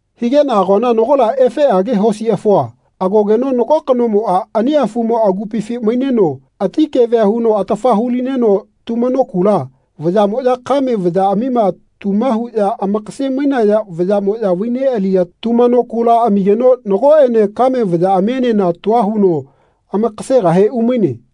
Higeꞌna agoana nagola efeꞌage hosi afua agogeno nago kanomoꞌa ani afumo agupifi maineno ati kevea huno atafa hu-lineno tumano kula, vayaꞌmoꞌya kame vayaꞌamima tuma huꞌya amakase-mainaya vayaꞌmoꞌya vai neꞌaliya tumano kula amigeno nagoꞌene kame vayaꞌamienena tua huno amakasegahe umaine.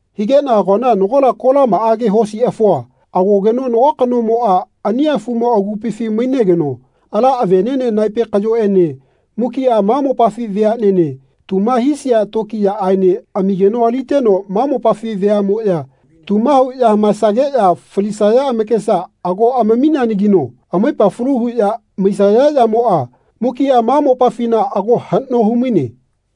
Higeꞌna agoana nagola kolamaꞌage hosi afua agogeno nago kanomoꞌa ani afumo agupifi mainegeno ala aveꞌneꞌne naepe kaꞌyoꞌene mukiꞌa ma mopafi veaꞌnene tuma hisia tokiyaꞌaene amigeno aliteno ma mopafi veaꞌmoꞌya tuma huꞌya hamaesageꞌya falisaya amakesa ago amamineanagino amaipa falu huꞌya maisaya yamoꞌa mukiꞌa ma mopafina ago haꞌno humaine.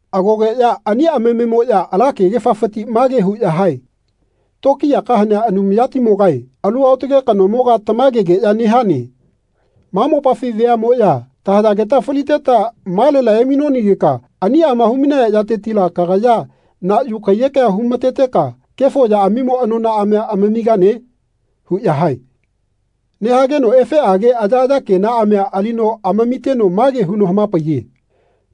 Agogeꞌya ani amamemoꞌya ala kegefafiti mage huꞌya hae “Tokiyaka hanea Anumayatimogae alu aotage kanomoga tamagegeꞌya nehane. Ma mopafi veaꞌmoꞌya tahayageta faliteta malela emainonanagika aniꞌama humainaya yatetila kagaya na yu kaiyekea hu-mateteka kefo yaꞌamimo anonaꞌamia amamigane?” huꞌya hae. Nehageno efeꞌage ayaꞌaya kenaꞌamia alino amamiteno mage huno hamapaiye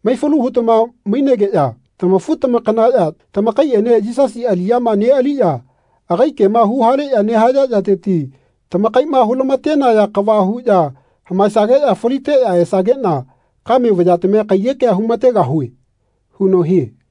“Maifalu hutama mainegeꞌya tamafu-tamakanaꞌya tamakaiꞌene Yisasi aliꞌyama neꞌaliꞌya agai kema huhaleꞌya nehaya yateti tamakaiꞌma hulamatenaya kava huꞌya hamaesageꞌya faliteꞌya esageꞌna kame vayatamia kaiyekea humategahue.” huno hie.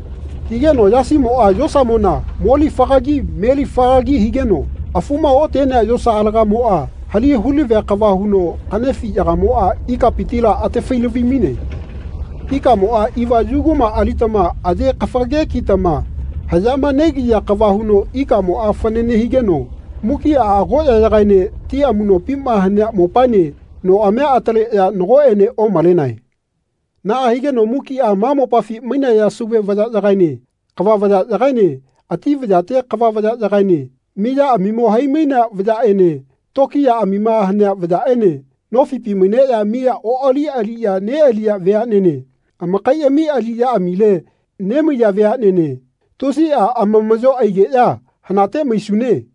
Higeno yasimoꞌa yosamona mo lifagagi me lifagagi higeno afuma otenea yosa alagamoꞌa halali hulavia kava huno kaꞌnefiꞌyagamoꞌa ikapitila atafai-lavi-maine. Ikamoꞌa iva yuguma alitama aye kafage kitama haꞌyama negiya kava huno ikamoꞌa fanane higeno mukiꞌa agoꞌyaene ti amuꞌnopima hanea mopaene noꞌamia ataleꞌya nagoꞌene omalenae. Naꞌa higeno mukiꞌa ma mopafi mainaya sauve vayaꞌyagaene kava vayaꞌyagaene ati vayate kava vayaꞌyagaene miyaꞌamimo hai-mainea veaꞌnene tokiyaꞌamima hanea vayaꞌene nofipi maineꞌya miya oꞌali aliꞌya neꞌaliya veaꞌnene amakaiꞌami aliꞌyaꞌamile nemaiya veaꞌnene tusiꞌa amamaꞌyo aigeꞌya “Hanate maisune.”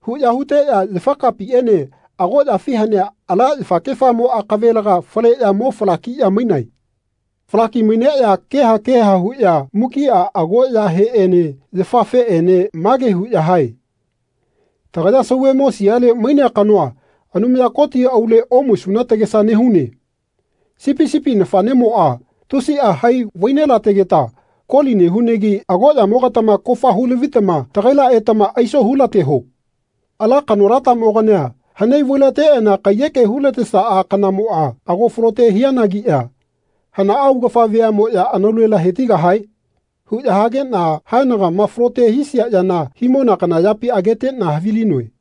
huꞌya huteꞌya yafakapiꞌene agoꞌyafi hanea ala yafakefamo akavelega faleꞌya mo falakiꞌya mainae. Fala kiꞌya maineꞌya keha keha huꞌya mukiꞌa agoꞌyaheꞌene yafafeꞌene mage huꞌya hae “Tagaya sauvemo siale mainea kanoa Anumaya Koti aule omaisuna tagesa nehune. Sipi sipi nafaꞌnemoꞌa tusiꞌa hai vai nelategeta koli nehunagi agoꞌyamogatama kofa hu-lavitama tagaila etama aiso hulateho. Ala kanolatamogania hanai vai-lateꞌana kaiyeke hulatesaꞌa kanamoꞌa ago falote hianagiꞌya hanaꞌa augafa veaꞌmoꞌya anaulela hetigahae?” huꞌya hageꞌna haenagama falote hisia yana himona kana yapi ageteꞌna havilinoe.